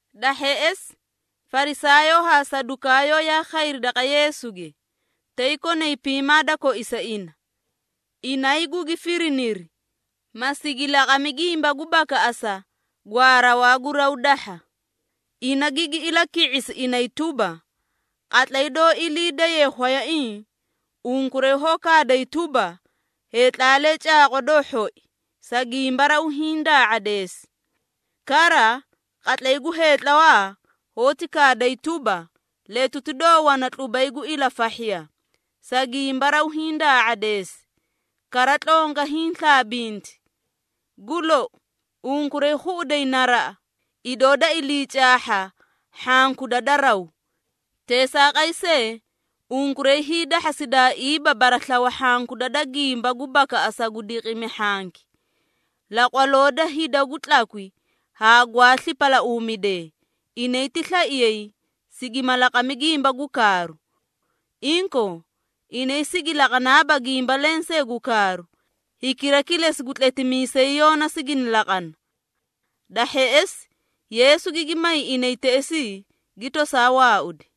Da hheꞌesi, Farisaayoo haa Sadukaayoo yaa khayri daqa Yeesuge, tay konay piimaa da koisa ina. Inay gugi firiniri, ma sigi laqami gimba gu bakaꞌasa gwaa rawaa gu raw dahha. Ina gigi ilaki⁄isi inay tuba, “Qatlay doó ilii daye khwayaiĩ, unkuray hoó kaaday tuba, ‘Heetlaalee caaqwa doo hhoi, sa gimba raw hiĩ daa⁄adeesi.’ Kara, qatlay gu heetlawaa hoóti kaaday tuba, ‘Letuti doo wana tlubay gu ilafahhiya, sa gimba raw hiĩ daa⁄adeesi, kara tlonga hiĩ slaabinti.’ Gu lou, unkuray khuꞌuday naraꞌa, idoo da ilii caahha hhankuda da raw. Teesaaqay see, unkuray hiidahhasidaaiiba baraslawa hhankuda da gimba gu bakaꞌasa gu diqimi hhanki. Laqwaloo da hida gu tlakwi haa gwaa slipalauumidee, inay ti slaiyay, sigima laqami gimba gu kaaru. Inkoo, inay sigi laqanaaba gimba lensee gu kaaru, hikira kilesi gu tletimiisay Yoona sigini laqana.” Da hheꞌesi, Yeesu gigi may inay teꞌesii, gi tosaa waaudi.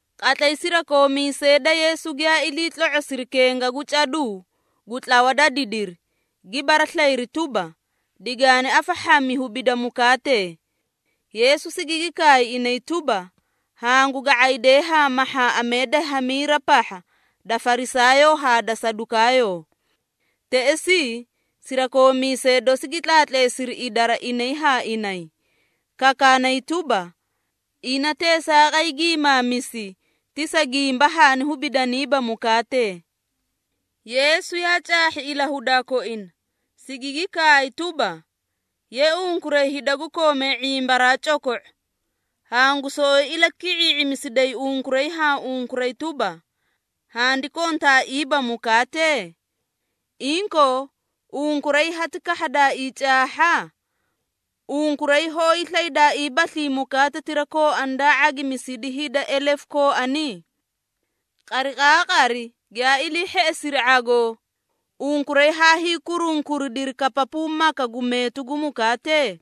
Qatlay sirakoomiisee da Yeesu giyaa ilii tlo⁄osiri kenga gu caduu gu tlawa da didiri, gi baraslayiri tuba, digaani afahhami hubida mukaatee. Yeesu sigigi kaay inay tuba, “Hangu ga⁄aydee haa mahhaaꞌamee da hamiira pahha da Farisaayoo haa da Sadukaayoo.” Teꞌesii, sirakoomiisee dosi gi tlaatleesidi idara inay haa inay, kakaanay tuba, “Ina teesaaqay giimaamisi, ti sa gimba haani hubidaniiba mukaatee.” Yeesu yaa caahhi ilahudaa koina, sigigi kaay tuba, “Ye unkuray hida gu koomee ⁄imbaraa coko⁄o! Hangu soꞌoyi ilaki⁄ii⁄imisiday unkuray haa unkuray tuba, handi kontaaiiba mukaatee? Inkoo, unkuray hati kahhadaaii caahha? Unkuray hoó hiislaydaaiibaslii mukaatetira kooani daa ⁄agimisidi hida elefu kooani? Qariqaaqari giyaa ilii hheꞌesiri ⁄agoo, unkuray haa hiikurunkuridiri kapapuu maka gu meetu gu mukaatee?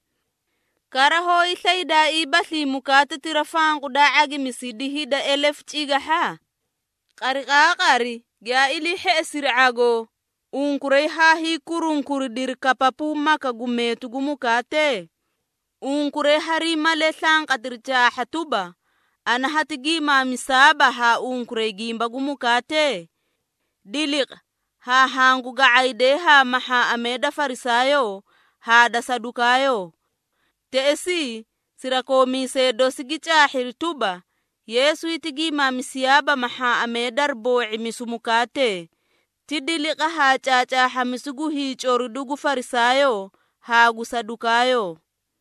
Kara, hoó hiislaydaaiibaslii mukaatetira fanqu daa ⁄agimisidi hida elefu cigahha? Qariqaaqari giyaa ilii hheꞌesiri ⁄agoo, unkuray haa hiikurunkuridiri kapapuu maka gu meetu gu mukaatee? Unkuray hariĩ malee slanqatiri caahha tuba, ana hati giimaamisaaba haa unkuray gimba gu mukaatee? Diliqa haa hangu ga⁄aydee haa mahhaaꞌamee da Farisaayoo haa da Sadukaayoo.” Teꞌesii, sirakoomiisee dosi gi caahhiri tuba, Yeesu hiti giimaamisiyaaba mahhaaꞌamee dari boo⁄imisu mukaatee, ti diliqa haa caacaahhamisu gu hiicoridu gu Farisaayoo haa gu Sadukaayoo.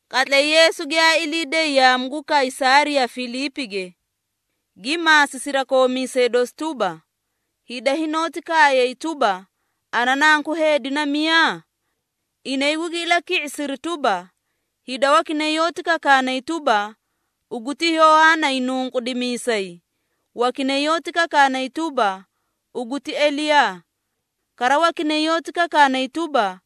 Qatlay Yeesu giyaa ilii day yaamu gu Kaysaariya Filiipige, gi maasi sirakoomiisee dosi tuba, “Hida hinoóti kaayay tuba, ana Nanku Heedi na miyaa?” Inay gugi ilaki⁄isiri tuba, “Hida wakinay yoóti kakaanay tuba, ugu ti Yohaana Hiinunqudimiisay, wakinay yoóti kakaanay tuba, ugu ti Eliyaa. Kara wakinay yoóti kakaanay tuba,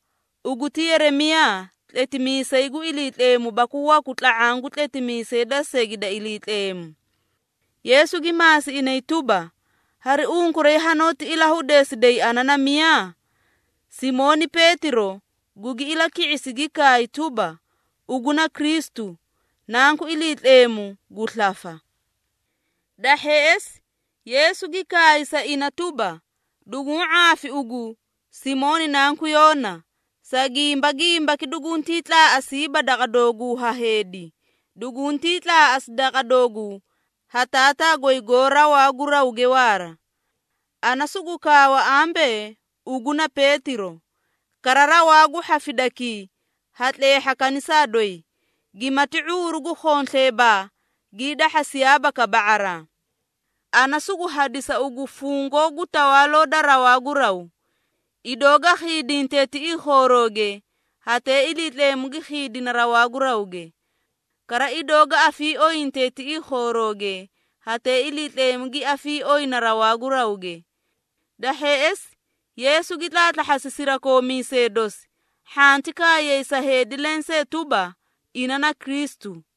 ugu ti Yeremiyaa tletimiisay gu Iliitleemu baku waku tla⁄aã gu tletimiisee da segi da Iliitleemu.” Yeesu gi maasi inay tuba, “Hari unkuray hanoóti ilahudeesiday ana na miyaa?” Simooni Peetiro gugi ilaki⁄isi gi kaay tuba, “Ugu na Kristu, Nanku Iliitleemu gu slafa.” Da hheꞌesi, Yeesu gi kaay sa ina tuba, “Duguũ ⁄aafi ugu, Simooni nanku Yoona, sa gimba gimbaki duguntii tlaaꞌasiiba daqa dooguu ha heedi, duguntii tlaaꞌasi daqa dooguu ha Taataa goy goó rawaa gu rawge waara. Ana sugu kaawa ambee ugu na Peetiro, kara rawaa gu hhafidakii ha tleehha kanisaa doyi, gimati ⁄uuru gu khonsleebaa gii dahhasiyaaba kaba⁄araa. Ana sugu hadisa ugu fungoo gu Tawaaloo da rawaa gu raw. Idoo ga khiidinte tiꞌii khoorooge, hatee Iliitleemu gi khiidina rawaa gu rawge. Kara idoo ga afiiooyinte tiꞌii khoorooge, hatee Iliitleemu gi afiiooyina rawaa gu rawge.” Da hheꞌesi, Yeesu gi tlaatlahhasi sirakoomiisee dosi, hhanti kaayay sa heedi lensee tuba, ina na Kristu.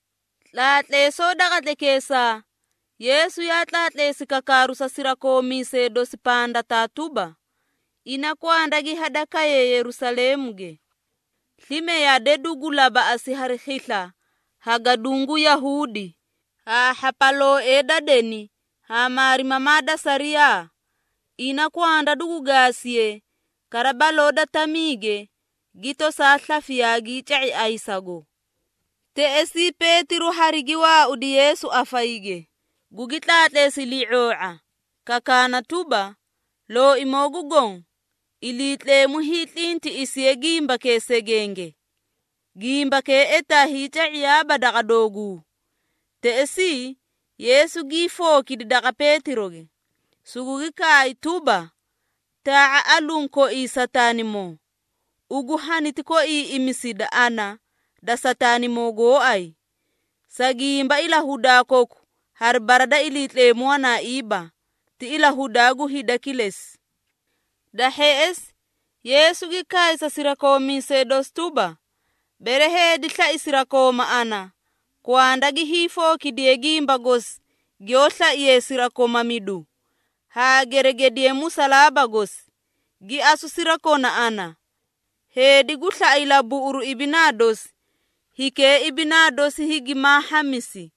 Tlaatleesoo da qatlaykeesaa, Yeesu yaa tlaatleesi kakaaru sa sirakoomiisee dosi pandataa tuba, ina kwanda gi hadakaye Yerusaleemuge. Slime yade dugu labaꞌasi hari khisla ha gaduũ gu Yahuudi, haa hhapalooee da deni haa maarimamaa da sariyaa. Ina kwanda dugu gaasiye, kara baloo da tamiige gi tosaa slafi yaagii ca⁄i ayisago. Teꞌesii, Peetiro harigi waaudi Yeesu afayige, gugi tlaatleesi ilii⁄oo⁄a, kakaana tuba, “Looimoo gu Goõ, Iliitleemu hiitlintiꞌisiye gimbakee segenge! Gimbakee etaa hiica⁄iyaaba daqa dooguu!” Teꞌesii, Yeesu gii fookidi daqa Peetiroge, sugugi kaay tuba, “Taa⁄a aluũ koii Sataanimoo! Ugu haniti koiiꞌimisida ana da Sataanimoo gooay, sa gimba ilahudaa koku hari bara da Iliitleemu wanaaiiba, ti ilahudaa gu hida kilesi.” Da hheꞌesi, Yeesu gi kaay sa sirakoomiisee dosi tuba, “Bere heedi slai sirakooma ana, kwanda gi hiifookidiye gimba gosi giyoó slaiye sirakomamidu, haa geregediye musalaaba gosi, gi asu sirakona ana. Heedi gu slaꞌa ilabuꞌuru ibinaa dosi, hikee ibinaa dosi higimaa hhamisi.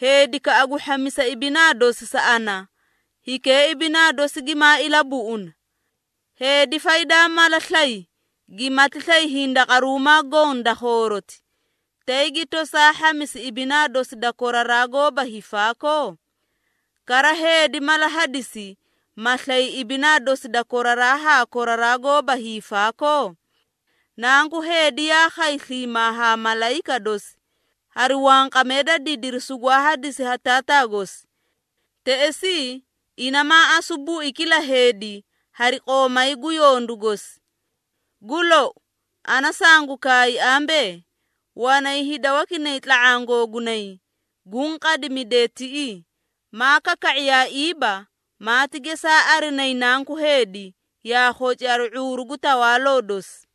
Heedikaꞌa gu hhamisa ibinaa dosi sa ana, hikee ibinaa dosi gimaa ilabuꞌuna. Heedi faydaa mala slay, gimati slay hindaqaruumaa goõ da khooroti, tay gi tosaa hhamisi ibinaa dosi da koraraa goóba hiifaakoo? Kara heedi mala hadisi, ma slay ibinaa dosi da koraraa haa koraraa goóba hiifaakoo? Nanku Heedi yaa khay sliimaa haa malayika dosi, hari wanqamee da didiri sugwaa hadisi ha Taataa gosi. Teꞌesii, ina maa asu bui kila heedi hari qoomay gu yondu gosi. Gu lou, ana sangu kaay ambee, wanay hida wakinay tla⁄aã googunay, guũ qadimidee tiꞌii, maa kaka⁄iyaaiiba, maati gesaa arinayi Nanku Heedi, yaa khoci hari ⁄uuru gu tawaaloo dosi.”